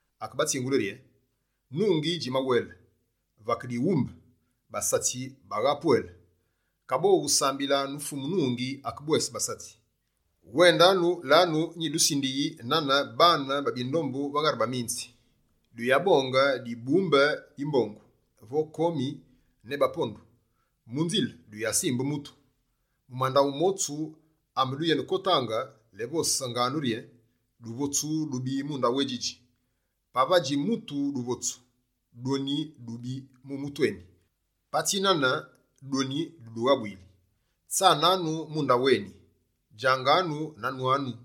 Akebatsingule rye: «Nungi djimawele, vake dighumbe, basatsi bagha pwele, kaboghu sambilanu Fumu nungi akebwese basatsi. Wendanu, lanu nyidusindiyi nane baane ba bindombu va ghari baminzi. Duyabonge dibumbe di mbongu vo komi ne bapondu. Mu nzile, duyasimbe mutu. Mu mandaghu motsu ameduyenekotaange, lévosanganu rye: “Duvotsu dubi mu ndaghu édjidji.” Pavadji mutu duvotsu, dwoni dubi mu mutu eni. Patsi nane, dwoni dudughabuyili. Tsananu mu ndaghu eni, djanganu na nwanganu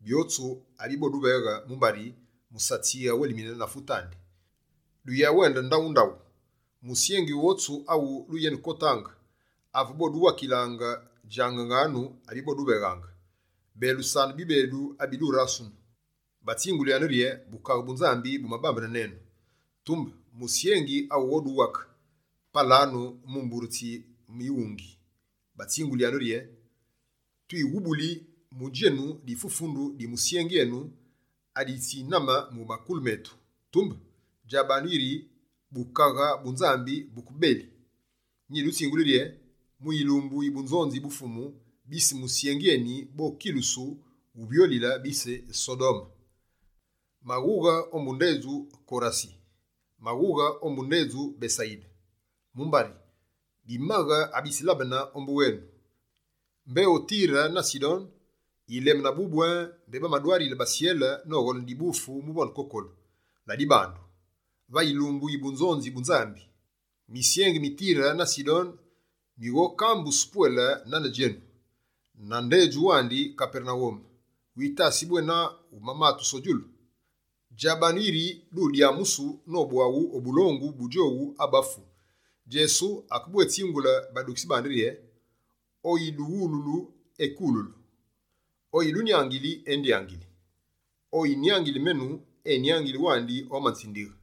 byotsu abiboduveghe mumbari musatsi awelimine na fute andi. Duyabe duyawende ndaghu na ndaghu. Musyengi wotsu awu duyenekotaange, ave boduwakile, djanganu abiboduveghe. Belusanu bibedu abi durasunu, batsingulyanu rye: Bukaghe bu Nzambi bumabambene nenu. Tumbe, musyengi awughoduwake, palanu mu mbure tsi mighungi, batsingulyanu rye: “Twighubuli mu djenu difufundu di musyengi enu aditsiname mu makulu metu, tumbe djabanu yiri Bukaghe bu Nzambi buke bebeli.” Nyidutsinguli rye: Mu yilumbu yi bunzonzi bu Fumu, bise musyengi eni bokilusu wuvyolile bise Sodome.» «Maghughe ombu ndedju Korasi, maghughe ombu ndewandi Besayide. Mumbari, bimaghe abitsilabane ombu wenu, mbé o Tire na Sidone, yileme nabubu mbé bamadwarile basyele nogholene dibufu muvonde kokolu. Ladibandu, va yilumbu yi bunzonzi bu Nzambi, misyengi mi Tire na Sidone mighokambusu pwele nane djenu. Na ndedju wandi Kapernawume, witasi bwena wumatusu o djulu? Djabanu yiri dudyamusu nobwaghu o bulongu bu djowu abafu.» Djesu akebwétsingule badukitsi bandi rye: «Oyiduwululu, ekululu; oyidunyaghuli, endyaghuli; oyinyaghuli menu, enyaghuli wandi omanzindighe.»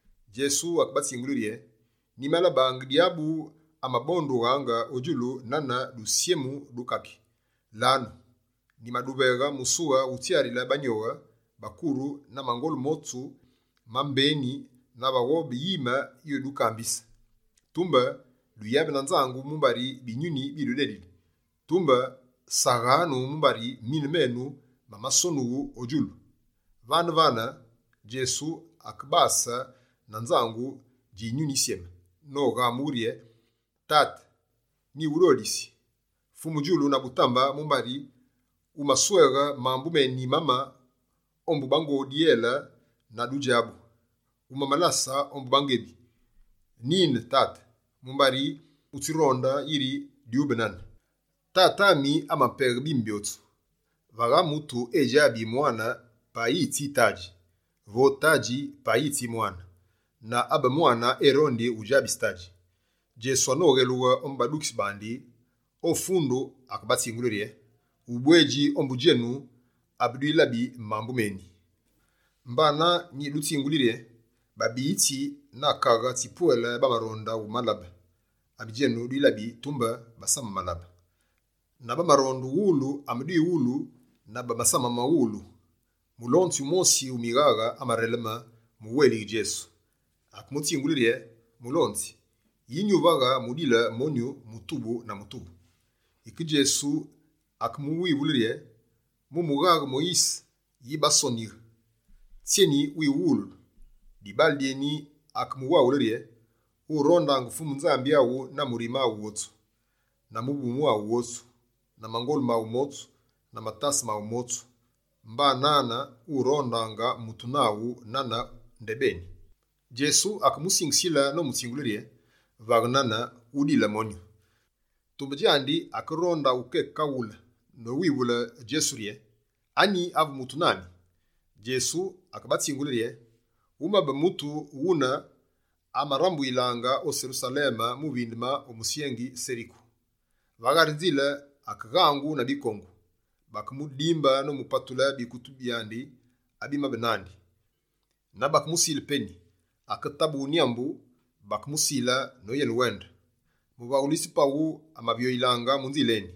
Djesu akebatsinguli rye: «Nyimalabe Dyabu amabondughaange o djulu nane dusyemu du kaki. Lanu, nyimaduveghe musughe utsyarile banyoghe, bakuru na mangolu motsu ma mbeni na vaghobe yime yudukambise. Tumbe duyabe na nzangu mumbari binyuni bidudedili. Tumbe saghanu mumbari mine menu masonughu o djulu.» Vane-vane, Djesu akebase na nzangu dji Yinyuni Yisyeme noghamughe rye: «Tate, nyiwudodisi, Fumu djulu na butambe mumbari wumasweghe mambu meni mama ombu bango dyele na dudjabu, wumamalase ombu bangebi. Nine Tate, mumbari wutsironde yiri dyube nane. Tate ami, amapeghe bimi byotsu. Vagha mutu edjabi Mwane payi tsi Tadji, vo Tadji payi tsi Mwane, na abe Mwane erondi udjabise Tadji.» Djesu anoghelughe ombu badukitsi bandi, o fundu akebatsingule rye: «Ubwedji ombu djenu abedwilabi mambu meni mame amedwilabi! Mbana, nyidutsinguli rye: babiyitsi na Kaghe tsipwele bamaronde wulabe abi djenu dwilabi tumbe basamabilabe. Na bamaronde uwulu amedwiwulu na basamamawulu.» Mulonzi wumosi wu mighaghe, amareleme mu wélighe Djesu. Akemutsingule rye: «Mulonzi yi nyuvaghe mudile monyu mutubu na mutubu?» Yike Djesu akemuwivule rye: «Mu mughaghe Moyise, yi basonighe? Tsyeni wiwuwululu?» Dibaale dyeni dikemuwaghule rye: «“Wurondaange Fumu Nzambi aghu na murime wotsu, na muvumu aghu wotsu, na mangolu maghu motsu, na matase maghu motsu.” Mba nane, “Wurondaange mutu naghu nane ndebeni.”» Djesu akemusingisile nomutsingule rye: «Vaghe nane, wudile monyu.» Tumbe djandi akeronde wukekaghule, nowivule Djesu rye: «Anyi avu mutu nami?» Djesu akebatsingule rye: «Wumabe mutu wune amarambuyilaange o Serusaleme mu vindeme o musyengi Seriku. Va ghari nzile akeghangu na bikongu, bakemudimbe nomupatule bikutu abimabe nandi na bakemusile peni, aketabughe nyambu, bakemusila noyenewende. Muvaghulitsi paghu amavyoyilaange mu nzile eni,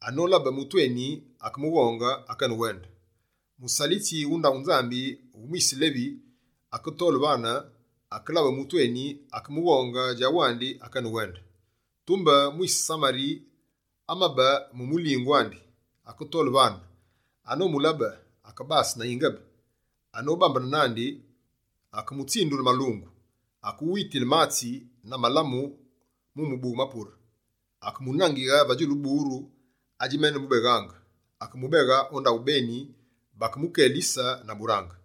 anolabe mutu eni akemughonge, akenewende. Musalitsi wu ndaghu Nzambi wu mwise Levi, aketole vane, akelabe mutu eni, akemughonge djawandi akenewende. Tumbe mwise Samari amabe mu mulingu andi, aketole vane, anomulabe, akebase na yingebe. Anobambene nandi, akemutsindule malungu, akewitile matsi na malamu mu mubughe mapure. Akemunangighe va djulu buru adjimenemubeghaange, akemubeghe o ndaghu beni bakemukelise na burange.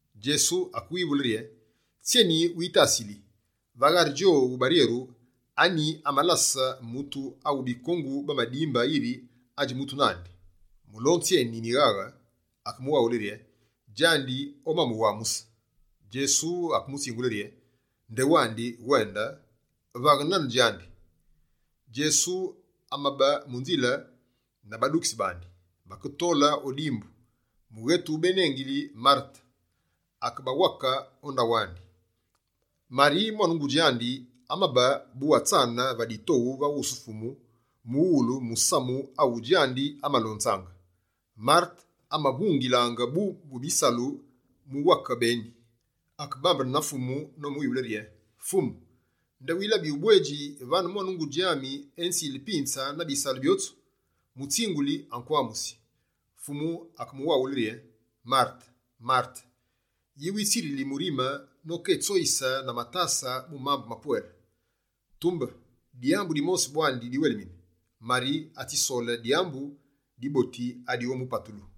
Djesu akemuwivule rye: «Tsyeni witasili? Va ghari djowu baryeru, anyi amalase mutu awu bikongu bamadimbe yiri adji mutu nandi?» Mulonzi eni mighaghe akemuwaghule: «Djandi omamuwamuse.» Djesu akemutsingule rye: «Ndewandi, wende. Vaghaange nane djandi.» Djesu amabe mu nzile na badukitsi bandi, baketole va dimbu, mughetu benengili Marete akebawake o ndaghu andi. Mari mwane ngudji andi amabe bu atsane va ditoghu va wusu Fumu mu ulungu musamu awu djandi amalonzaange. Marete amavungilaange bu mu bisalu muwake beni. Akebambene na Fumu nomuwivule rye: «Fumu, nde wilabi ubwedji vane mwane ngudji ami enzili pinze na bisalu byotsu? Mutsinguli, akwamusi!» Fumu akemuwaghule rye: «Marete, Marete! Yi witsirili murime noketsoyise na matase mu mambu mapwele? Tumbe, dyambu dimosi bwandi diwelimine. Mari, atsisole dyambu diboti adighomupatulu.»